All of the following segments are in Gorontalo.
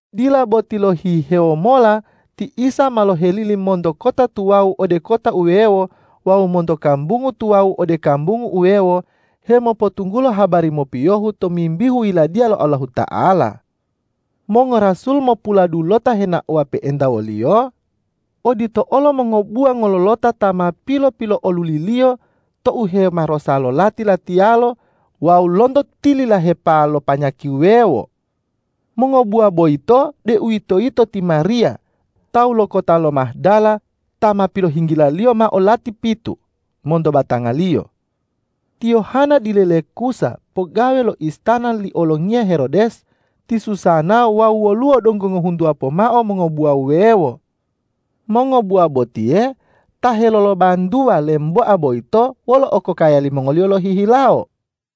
Dila boti lohihewo mola ti Isa ma lohelili monto kota tuwawu ode kota wuwewo wawu monto kambungu tuwawu ode kambungu wuwewo hemopotunggulo habari mopiyohu tomimbihu Yiladiya lo Allahuta'ala. Mongorasul mopuladulota henaowa pe'enta wo-Liyo, odito olo mongobuwa ngololota ta ma pilo-pilo'oluli-Liyo to uhemarosa lo lati-latiyalo wawu lonto tililahepa lo panyaki wuwewo. Mongobuwa boyito, deuwitoyito ti Mariya tawu lo kota lo Mahdala ta ma pilohinggila-Liyo mao lati pitu monto batangaliyo, ti Yohana dile le Khuza pogawe lo istana li olongiya Herodes, ti Susana wawu woluwo donggo ngohuntuwa pomao mongobuwa wuwewo. Mongobuwa botiye ta helolobantuwa lemboa boyito wolo okokaya limongoliyo lohihilawo.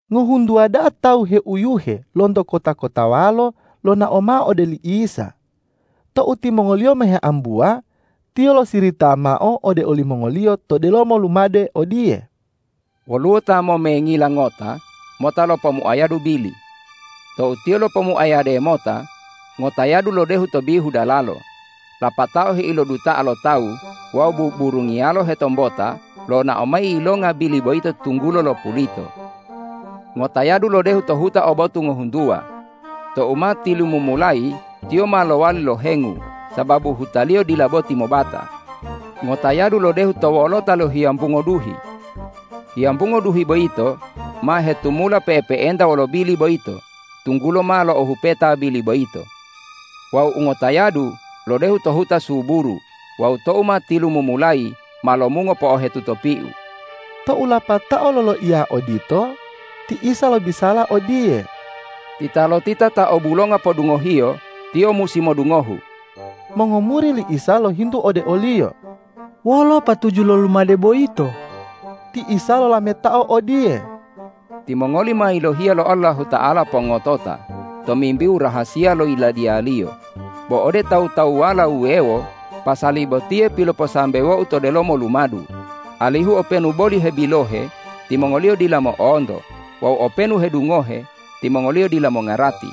Ngohuntuwa da'a tawu heuyuhe lonto kota-kotawalo lonao mao ode li Isa. Tou timongoliyo ma heambuwa, Tiyo losirita mao ode olimongoliyo to delomo lumade odiye, ”Woluwo ta momengila ngota mota lopomuayadu bili. Tou tiyo lopomuayade mota, ngotayadu lodehu to bihu dalalo, lapatao heiloduta'a lo tawu wawu buburungiyalo hetombota lonao mayi yilonga bili boyito tunggulo lopulito. Ngotayadu lodehu to huta o botu ngohuntuwa. Tou ma tilumumulayi, tiyo ma lowali lohengu, sababu hutaliyo dila boti mobata. Ngotayadu lodehu to wolota lohiyambungo duhi. Hiyambungo duhi boyito ma hetumula pe'epe'enta wolo bili boyito tunggulo ma lo'ohupeta bili boyito. Wawu u ngotayadu lodehu to huta suburu wawu tou ma tilumumulayi ma lomungo po'ohetuto piu.” Tou lapatao loloiya odito, ti Isa lobisala odiye,”Titalotita ta obulonga podungohiyo, tiyo musi modungohu!” Mongomuri li Isa lohintu ode o-Liyo,”Wolo patuju lo lumade boyito?” Ti Isa lolametao odiye,”Timongoli ma yilohiya lo Allahuta'ala pongotota tomimbihu rahasiya lo Yiladiya-Liyo, bo ode tawu-tawuwala wuwewo pasali botiye piloposambewo-U to delomo lumadu, alihu openu boli hebilohe, timongoliyo dila mo'onto wawu openu hedungohe, timongoliyo dila mongarati.”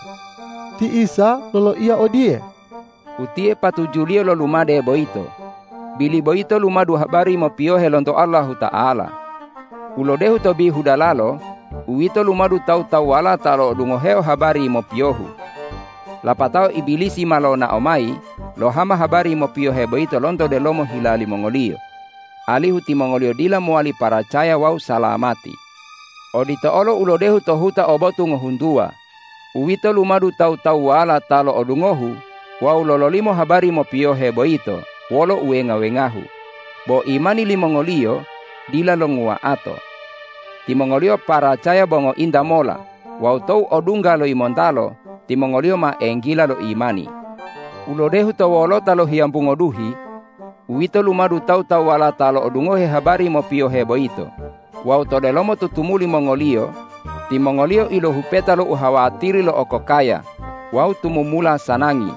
Ti Isa loloiya odiye,”Utiye patujuliyo lo lumade boyito: Bili boyito lumadu habari mopiyohe lonto Allahuta'ala. U lodehu to bihu dalalo, uwito lumadu tawu-tawuwala ta lo'odungoheo habari mopiyohu. Lapatao Ibilisi ma lonao mayi lohama habari mopiyohe boyito lonto delomo hila limongoliyo, alihu timongoliyo dila mowali paracaya wawu salamati. Odito olo u lodehu to huta o botu ngohuntuwa, uwito lumadu tawu-tawuwala ta lo'odungohu wawu lololimo habari mopiyohe boyito wolo uwenga-wengahu, bo imani limongoliyo dila longuwa'ato. Timongoliyo paracaya bo ngointa mola wawu tou odungga lo yimontalo, timongoliyo ma enggila lo imani. U lodehu to wolota lohiyambungo duhi, uwito lumadu tawu-tawuwala ta lo'odungohe habari mopiyohe boyito wawu to delomo tutumuli mongoliyo, timongoliyo ilohupeta lo uhawatiri lo okokaya wawu tumumula sanangi,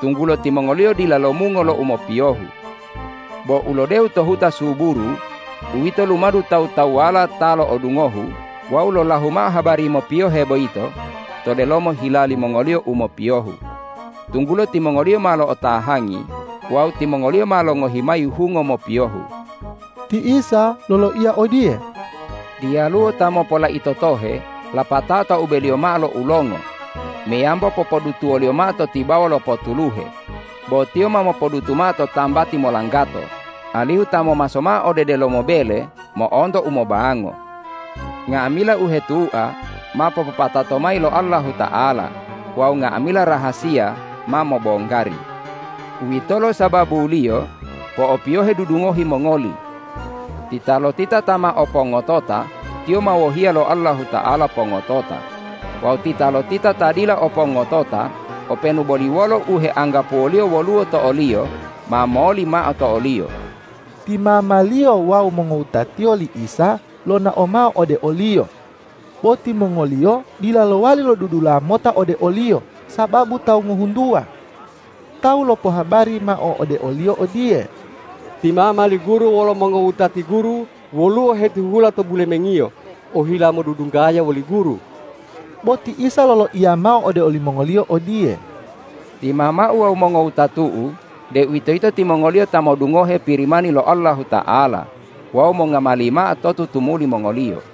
tunggulo timongoliyo dila lomungo lo u mopiyohu. Bo u lodehu to huta suburu, uwito lumadu tawu-tawuwala ta lo'odungohu wawu lolahu mao habari mopiyohe boyito to delomo hila limongoliyo u mopiyohu, tunggulo timongoliyo ma lo'otahangi wawu timongoliyo ma longohi mayi hungo mopiyohu.” Ti Isa loloiya odiye,”Diyaluwo ta mopolaito tohe lapatao taubeliyo mao lo ulongo meyambo popodutuwoliyo mao to tibawa lo potuluhe, bo tiyo ma mopodutu mao to tambati molanggato, alihu ta momaso mao ode delomo bele mo'onto umobango. Nga'amila u hetua ma popopatato mayi lo Allahuta'ala wawu nga'amila rahasiya ma mobonggari. Uwito sababuliyo po'opiyohe dudungohi mongoli. Titalotita ta ma o pongotota, tiyo ma wohiya lo Allahuta'ala pongotota; wawu titalotita ta dila o pongotota, openu boli wolo u heanggapuwoliyo woluwo to oliyo ma moli mao to oliyo.” Ti mama-Liyo wawu mongowuta-Tiyo li Isa lonao mao ode o-Liyo, bo timongoliyo dila lowali lodudula mota ode o-Liyo sababu tawu ngohuntuwa. Tawu lopohabari mao ode o-Liyo odiye,”Ti mama li Guru wolo mongowutati Guru woluwo hetihula to bulemengiyo ohila modudunggaya woli Guru.” Bo ti Isa loloiya mao ode olimongoliyo odiye,”Ti mama-U wawu mongowutatu-U, deuwitoyito timongoliyo ta modungohe Pirimani lo Allahuta'ala wawu mongamali mao to tutumuli mongoliyo.”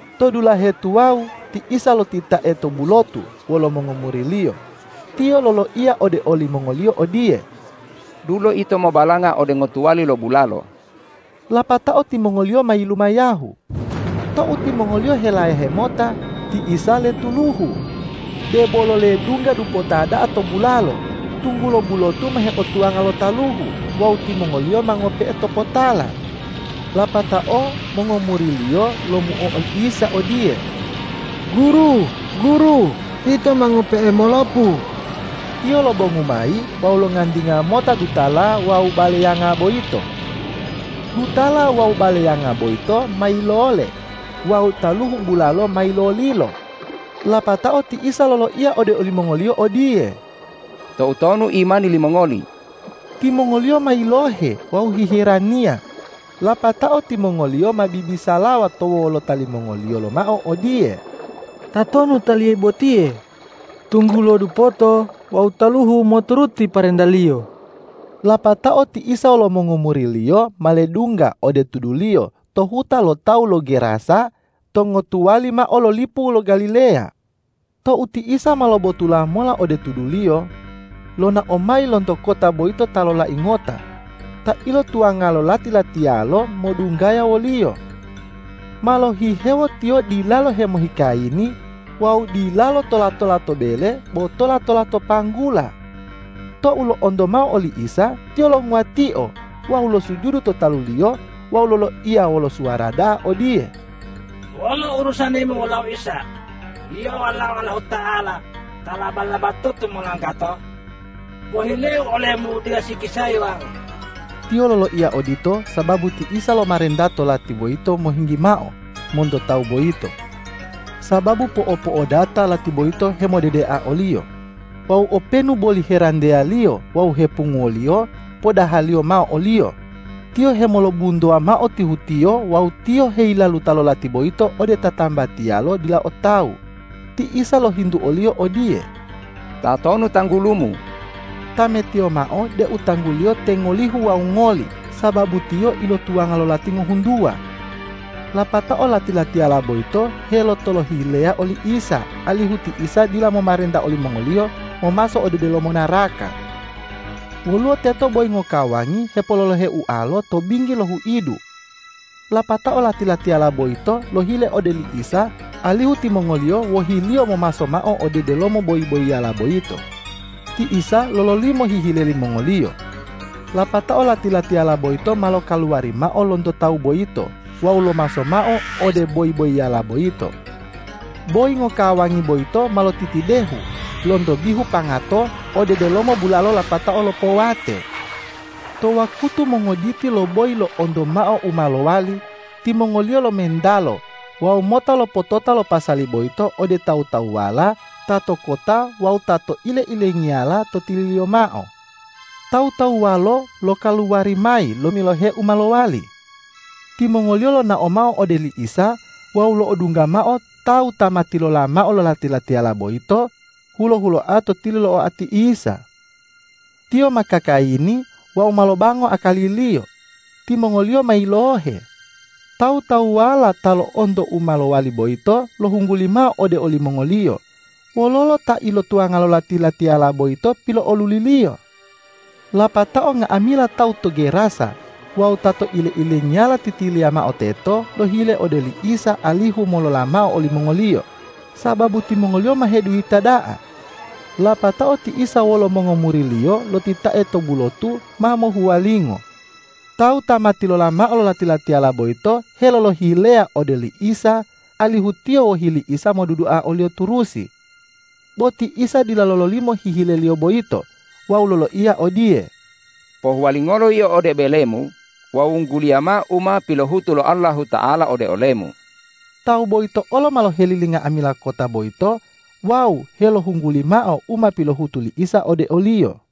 To dulahe tuwawu ti Isa lotitae to bulotu wolo mongomuri-Liyo. Tiyo loloiya ode olimongoliyo odiye,”Dulo ito mobalanga ode ngotuwali lo bulalo.” Lapatao timongoliyo ma yilumayahu. Tou timongoliyo helayahe mota, ti Isa letuluhu. Debolo ledungga dupota da'a to bulalo, tunggulo bulotu ma heotuwanga lo taluhu wawu timongoliyo ma ngope'e topotala. Lapatao mongomuri-Liyo lomuo oli Isa, odiye,”Guru, Guru, ito ma ngope'e molopu!” Tiyo lobongu mayi wawu longantinga mota dutala wawu baleyanga boyito. Dutala wawu baleyanga boyito ma yilole wawu taluhu bulalo ma yilolilo. Lapatao ti Isa loloiya ode olimongoliyo odiye,”Toutonu imani limongoli?” Timongoliyo ma yilohe wawu hiheraniya, lapatao timongoliyo ma bibisalawa to wolota limongoliyo lomao odiye,”Tatonu Taliye botiye, tunggulo dupoto wawu taluhu moturuti parenta-Liyo!” Lapatao ti Isa wolo mongomuri-Liyo ma ledungga ode tuduliyo to huta lo tawu lo Gerasa to ngotuwali mao lo lipu lo Galileya. Tou ti Isa ma lobotula mola ode tuduliyo, lonao mayi lonto kota boyito ta lolai ngota ta ilotuwanga lo lati-latiyalo modunggaya wo-Liyo. Ma lohihewo tiyo dilalo hemohikayini wawu dilalo tola-tola to bele, bo tola-tola to panggula. Tou lo'onto mao oli Isa, tiyo longuwatio wawu losujudu to talu-Liyo wawu loloiya wolo suwara da'a odiye,”Wolo urusani-Mu wolau Isa, Yio Walao Allahuta'ala ta laba-labatutu molanggato? Pohileu ole-Mu dila sikisayi wau!” Tiyo loloiya odito sababu ti Isa lomarenta to lati boyito mohinggi mao monto tawu boyito. Sababu po'opo'odata lati boyito hemodedea oliyo. Wawu openu boli heranteyaliyo wawu hepunguwoliyo podahaliyo mao oliyo, tiyo hemolobuntowa mao tihutiyo wawu tiyo heyilaluta lo lati boyito ode tatambatiyalo dila o tawu. Ti Isa lohintu oliyo odiye,”Tatonu tanggulumu?” Tametiyo mao deu tangguliyo te Ngolihu wawu Ngoli, sababu tiyo ilotuwanga lo lati ngohuntuwa. Lapatao lati-latiyala boyito helotolohileya oli Isa, alihu ti Isa dila momarenta olimongoliyo momaso ode delomo naraka. Woluwo teto boyi ngokawangi hepololohe ualo to binggi lo huidu. Lapatao lati-latiyala boyito lohile ode li Isa alihu timongoliyo wohi-Liyo momaso mao ode delomo boyi-boyiyala boyito. Ti Isa lololimo hihile limongoliyo. Lapatao lati-latiyala boyito ma lokaluwari mao lonto tawu boyito wawu lomaso mao ode boyi-boyiyala boyito. Boyi ngokawangi boyito ma lotitidehu lonto bihu pangato ode delomo bulalo lapatao lopowate. To wakutu mongoditi lo boyi lo'onto mao u ma lowali, timongoliyo lomentalo wawu mota lopotota lo pasali boyito ode tawu-tawuwala ta to kota wawu ta to ile-ilengiyala to tililiyo mao. Tawu-tawuwalo lokaluwari mayi lomilohe u ma lowali. Timongoliyo lonao mao ode li Isa wawu lo'odungga mao tawu ta ma tilola mao lo lati-latiyala boyito hulo-huloa to tili lo oati Isa. Tiyo ma kakayini wawu ma lobango akaliliyo. Timongoliyo ma yilohe. Tawu-tawuwala ta lo'onto u ma lowali boyito lohungguli mao ode olimongoliyo, wololo ta ilotuwanga lo lati-latiyala boyito pilo'oluli-Liyo. Lapatao nga'amila tawu to Gerasa wawu ta to ile-ilengiyala titiliya mao teto lohile ode oli Isa alihu molola mao olimongoliyo, sababu timongoliyo ma heduyita da'a. Lapatao ti Isa wolo mongomuri-Liyo lotitae to bulotu ma mohuwalingo. Tawu ta ma tilola mao lo lati-latiyala boyito helolohileya ode oli Isa alihu tiyo wohi li Isa modudua o-Liyo turusi. Bo ti Isa dila lololimo hihileliyo boyito wawu loloiya odiye, ”Pohuwalingolo yio ode belemu wawu wungguliya mao u ma pilohutu lo Allahuta'ala ode olemu.” Tawu boyito olo ma lohelili nga'amila kota boyito wawu helohungguli mao u ma pilohutu li Isa ode oliyo.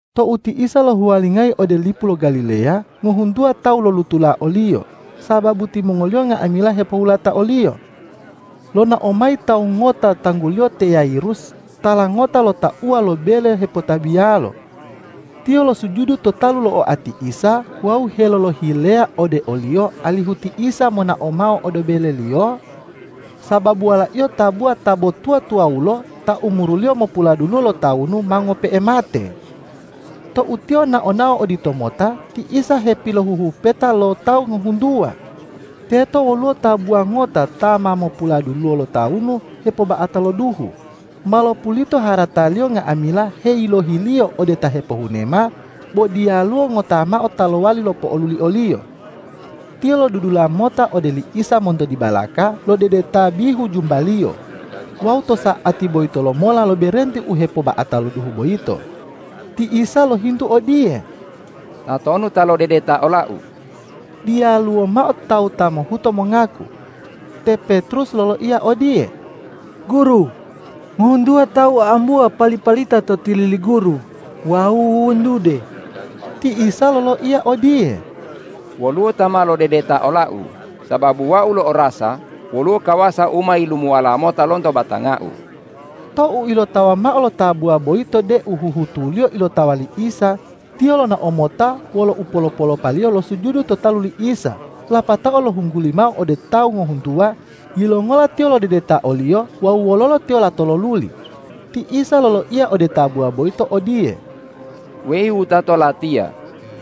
Tou ti Isa lohuwalingayi ode lipu lo Galileya, ngohuntuwa tawu lolutula o-Liyo, sababu timongoliyo nga'amila hepohulata o-Liyo. Lonao mayi tawu ngota tangguliyo te Yairus tala ngota lo tauwa lo bele hepotabiyalo. Tiyo losujudu to talu lo oati Isa wawu helolohileya ode o-Liyo alihu ti Isa monao mao ode beleliyo, sababu walaiyo tabuwa ta bo tuwa-tuwawulo ta umuruliyo mopuladuluwo lotawunu, ma ngope'e mate. Tou Tiyo nao-nao oditomota, ti Isa hepilohuhupeta lo tawu ngohuntuwa. Teto woluwo tabuwa ngota ta ma mopuladuluwo lotawunu hepoba'ata lo duhu, ma lopulito harataliyo nga'amila heyilohiliyo ode ta hepohunema, bo diyaluwo ngota mao ta lowali lopo'oluli oliyo. Tiyo lodudula mota ode oli Isa monto dibalaka lodedeta bihu jumba-Liyo wawu to sa'ati boyito lomola loberenti u hepoba'ata lo duhu boyito. Ti Isa lohintu odiye,”Tatonu ta lodedeta ola-U?” Diyaluwo mao tawu ta mohuto mongaku. Te Petrus loloiya odiye,”Guru, ngohuntuwa tawu a'ambuwa pali-palita to tili li Guru wawu wuwuntude!” Ti Isa loloiya odiye,”Woluwo ta ma lodedeta ola-U, sababu Wau lo'orasa woluwo kawasa u ma yilumuwala mota lonto batanga-U.” Tou ilotawa mao lo tabuwa boyito deu huhutuliyo ilotawa li Isa, tiyo lonao mota wolo upolo-polopaliyo losujudu to talu li Isa lapatao lohungguli mao ode tawu ngohuntuwa yilongola tiyo lodedeta o-Liyo wawu wololo tiyo lato loluli. Ti Isa loloiya ode tabuwa boyito odiye,”Weyi wutato Latiya,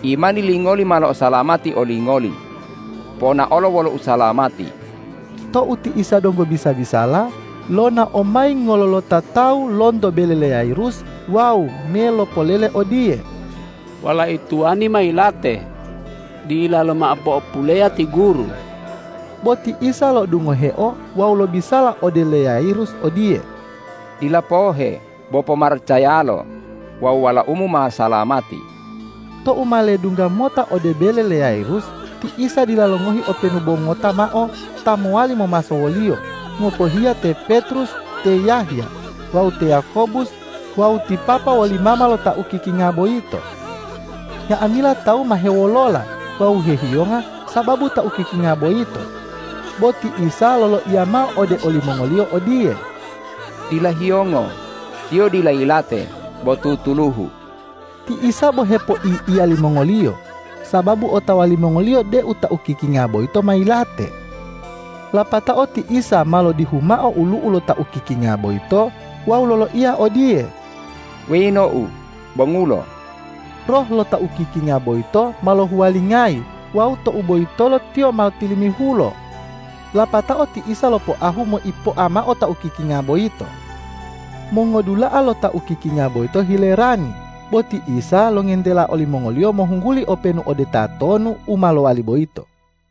imani lingoli ma lo'osalamati olingoli. Ponaolo wolo usalamati.” Tou ti Isa donggo bisa-bisala, lonao mayi ngololota tawu lonto bele le Yairus wawu me lopolele odiye,”Walai tuwani ma yilate. Dilalo mao po'opuleya ti Guru.” Bo ti Isa lo'odungoheo wawu lobisala ode le Yayirus odiye,”Dila pohe, bo pomaracayalo wawu walaumu ma salamati.” Tou ma ledungga mota ode bele le Yairus, ti Isa dila longohi openu bo ngota mao ta mowali momaso wo-Liyo, ngopohiya te Petrus, te Yahya wawu te Yakobus wawu ti papa woli mama lo ta ukikinga boyito. Nga'amila tawu ma hewolola wawu hehiyonga sababu ta ukikinga boyito, bo ti Isa loloiya mao ode olimongoliyo odiye,”Dila hiyongo. Tiyo dila yilate bo tutuluhu!” Ti Isa bo hepoi'iya limongoliyo, sababu otawa limongoliyo deu ta ukikinga boyito ma yilate. Lapatao ti Isa ma lodihu mao olu'u lo ta ukikinga boyito wawu loloiya odiye,”Weyi nou, bongulo!” Roh lo ta ukikinga boyito ma lohuwalingayi wawu tou boyitolo tiyo ma tilimihulo. Lapatao ti Isa lopoahu moipoa mao ta ukikinga boyito. Mongodula'a lo ta ukikinga boyito hilerani, bo ti Isa longentela olimongoliyo mohungguli openu ode tatonu, u ma lowali boyito.